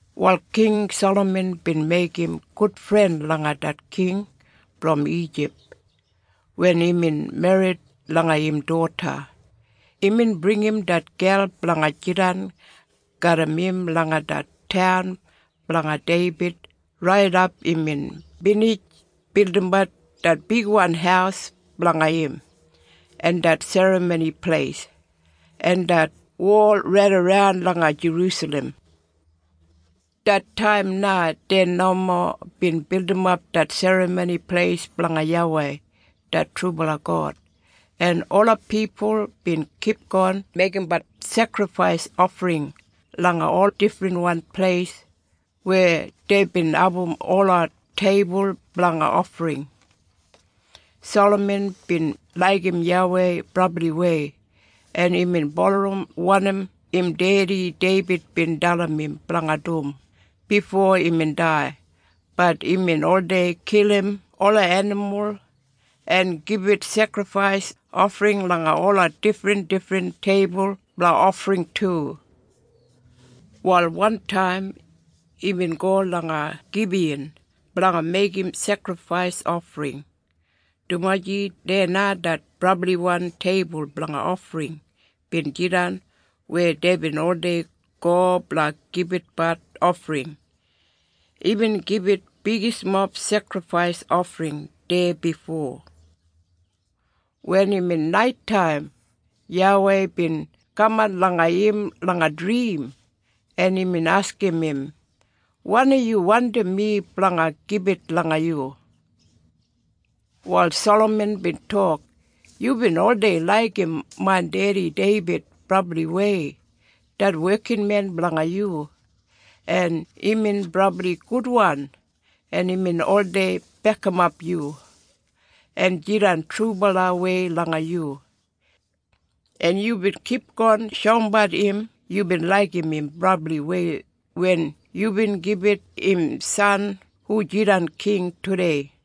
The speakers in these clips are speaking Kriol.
Wal King Salaman bin meigim gudfren langa det king brom Ijip wen imbin merrit langa im doda. Imbin bringim det gel blanga jidan garram im langa det taun blanga Deibid raidap imbin binij bildimbat det bigwan haus blanga im, en det Serramoni Pleis, en det wol raidaran langa Jerusalem. Det taim na dei nomo bin bildimap det Serramoni Pleis blanga YAWEI det trubala God, en ola pipul bin kipgon meigimbat sekrifais ofring langa ol difrinwan pleis weya deibin abum ola teibul blanga ofring. Salaman bin laigim YAWEI brabliwei, en imbin bulurrum wanim im dedi Deibid bin dalim im blanga dum bifo imbin dai, bat imbin oldei kilim ola enimul en gibit sekrifais ofring langa ola difrindifrin teibul blanga ofring du. Wal wantaim imbin go langa Gibiyan blanga meigim sekrifais ofring, dumaji deya na det brabliwan teibul blanga ofring bin jidan weya deibin oldei go blanga gibitbat ofring. Imbin gibit bigismob sekrifais ofring deya bifo. Wen imbin naitaim YAWEI bin kaman langa im langa drim en imbin askim im, “Wanim yu wandim mi blanga gibit langa yu?” Wal Salaman bin tok, “Yubin oldei laigim main dedi Deibid brabliwei det wekinmen blanga yu, en imbin brabli gudwan en imbin oldei bekimap yu, en jidan trubalawei langa yu. En yubin kipgon shoumbat im yubin laigim im brabliwei wen yubin gibit im san hu jidan king tudei.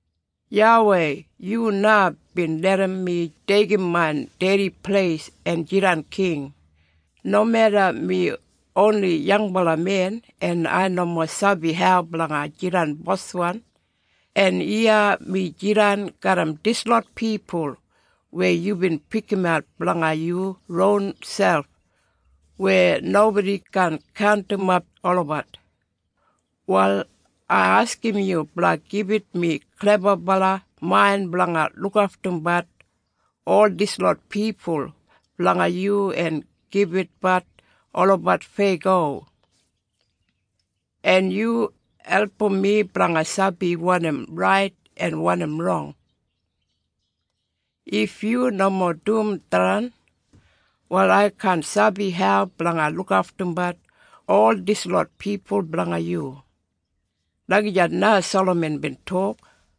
YAWEI yu na bin larram mi deigim main dedi pleis en jidan king, nomeda mi oni yangbala men en ai nomo sabi hau blanga jidan boswan. En iya mi jidan garram dislot pipul weya yubin pikimat blanga yu ronselp weya nobodi kaan kaundimap olabat. Wal ai askim yu blanga gibit mi klebabala main blanga lukaftumbat ol dislot pipul blanga yu en gibitbat olabat feyago. En yu album mi blanga sabi wanim rait en wanim rong. If yu nomo dum tharran, wal ai kaan sabi hau blanga lukaftumbat ol dislot pipul blanga yu.” Lagijat na Salaman bin tok.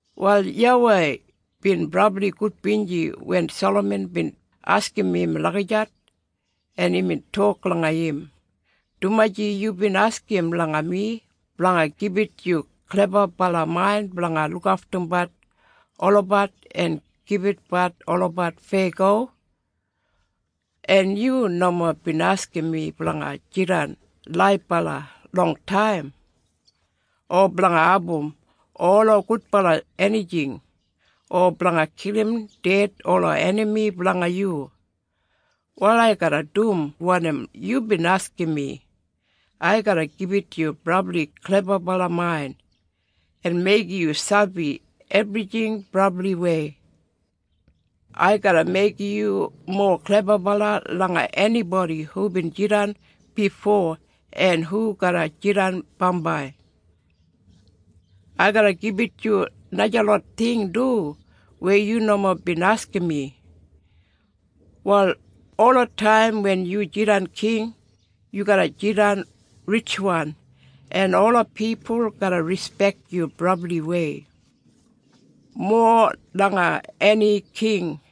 Wal YAWEI bin brabli gudbinji wen Salaman bin askim im lagijat, en imbin tok langa im, “Dumaji yubin askim langa mi blanga gibit yu klebabala main blanga lukaftumbat olabat en gibitbat olabat feyago, en yu nomo bin askim mi blanga jidan laibala longtaim, o blanga abum ola gudbala enijing, o blanga kilim ded ola enami blanga yu. Wal ai garra dum wanim yubin askim mi. Ai garra gibit yu brabli klebabala main, en meigim yu sabi ebrijing brabliwei. Ai garra meigim yu mowa klebabala langa enibodi hubin jidan bifo en hu garra jidan bambai. Ai garra gibit yu najalot ting du weya yu nomo bin askim mi. Wal olataim wen yu jidan king yu garra jidan ritjwan, en ola pipul garra rispek yu brabliwei, mowa langa eni king.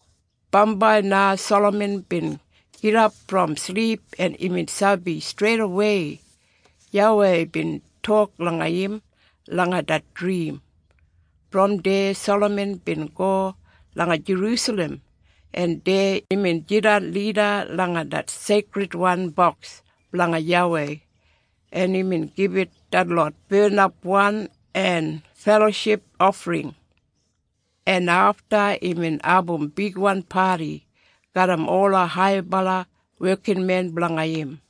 Bambai na Salaman bin gidap brom silip en imbin sabi streidawei YAWEI bin tok langa im langa det drim. Brom deya Salaman bin go langa Jerusalem en deya imbin jandap lida langa det Seikridwan Boks blanga YAWEI, en imbin gibit detlot barnapwan en feloship ofring. En afta imbin abum bigwan padi garram ola haibala wekinmen blanga im.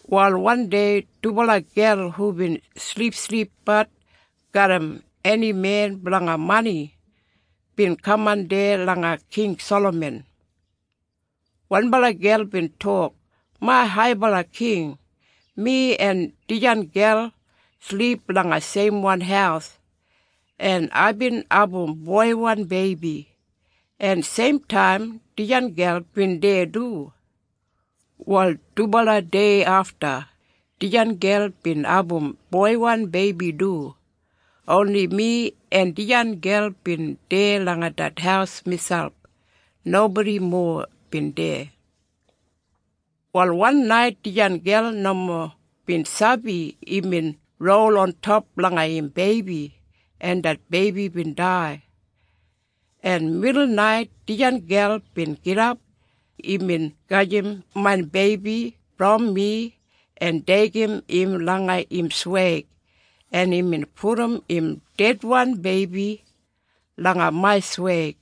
Wal wandei dubala gel hubin silipsilipbat garram eni men blanga mani, bin kaman deya langa King Salaman. Wanbala gel bin tok, “Main Haibala King, mi en dijan gel silip langa seimwan haus, en aibin abum boiwan beibi en seimtaim dijan gel bin deya du. Wal dubala dei afta, dijan gel bin abum boiwan beibi du. Oni mi en dijan gel bin deya langa det haus miselp. Nobodi mowa bin deya. Wal wan nait dijan gel nomo bin sabi imbin rol ontop langa im beibi en det beibi bin dai. En midulnait dijan gel bin gidap, imbin gajim main beibi brom mi en deigim im langa im sweig en imbin pudum im dedwan beibi langa main sweig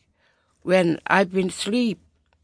wen aibin silip.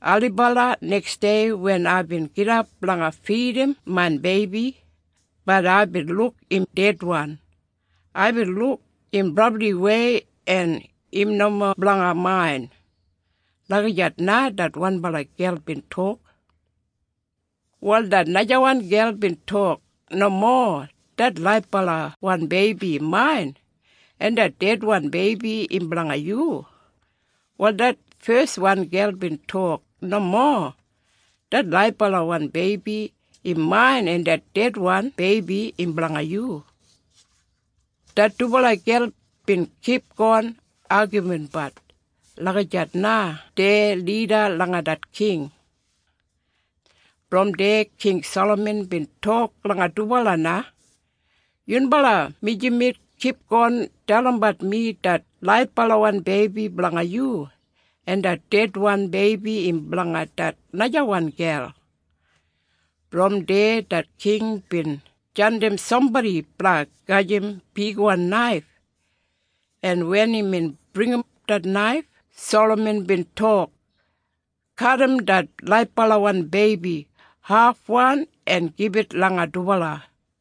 Ailibala neksdei wen aibin gidap blanga fidim main beibi, bat aibin luk im dedwan. Aibin luk im brabliwei en im nomo blanga main.” Lagijat na det wanbala gel bin tok. Wal det najawan gel bin tok, “Nomo! Det laibalawan beibi im main, en det dedwan beibi im blanga yu.” Wal det feswan gel bin tok, “Nomo! Det laibalawan beibi im main en det dedwan beibi im blanga yu.” Det dubala gel bin kipgon agaminbat lagijat na deya lida langa det king. Brom deya King Salaman bin tok langa dubala na, “Yunbala mijamet kipgon dalimbat mi det laibwan beibi blanga yu, en det dedwan beibi im blanga det najawan gel.” Brom deya det king bin jandim sambodi blanga gajim bigwan naif en wen imbin bringim det naif Salaman bin tok, “Kadim det laibalawan beibi hafwan en gibit langa dubala.”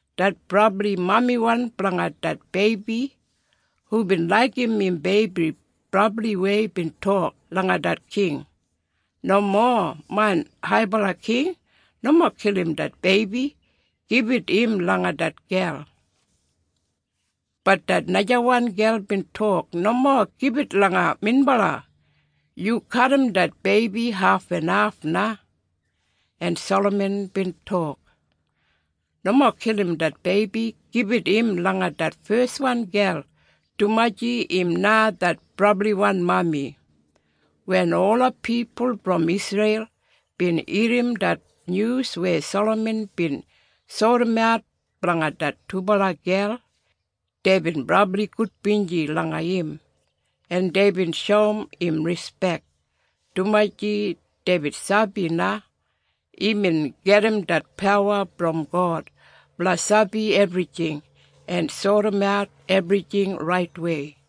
Det brabliwan mami blanga det beibi hubin laigim im beibi brabliwei bin tok langa det King, “Nomo main Haibala King! Nomo kilim det beibi! Gibit im langa det gel!” Bat det najawan gel bin tok, “Nomo gibit langa minbala. Yu kadim det beibi hafenhaf na.” En Salaman bin tok, “Nomo kilim det beibi. Gibit im langa det feswan gel, dumaji im na im brabliwan mami.” Wen ola pipul brom Isreil bin irrim det nyus weya Salaman bin sodimat blanga det dubala gel, deibin brabli gudbinji langa im, en deibin shoum im rispek, dumaji deibin sabi na imbin gedim det pawa brom God blanga sabi ebrijing en sodimat ebrijing raitwei.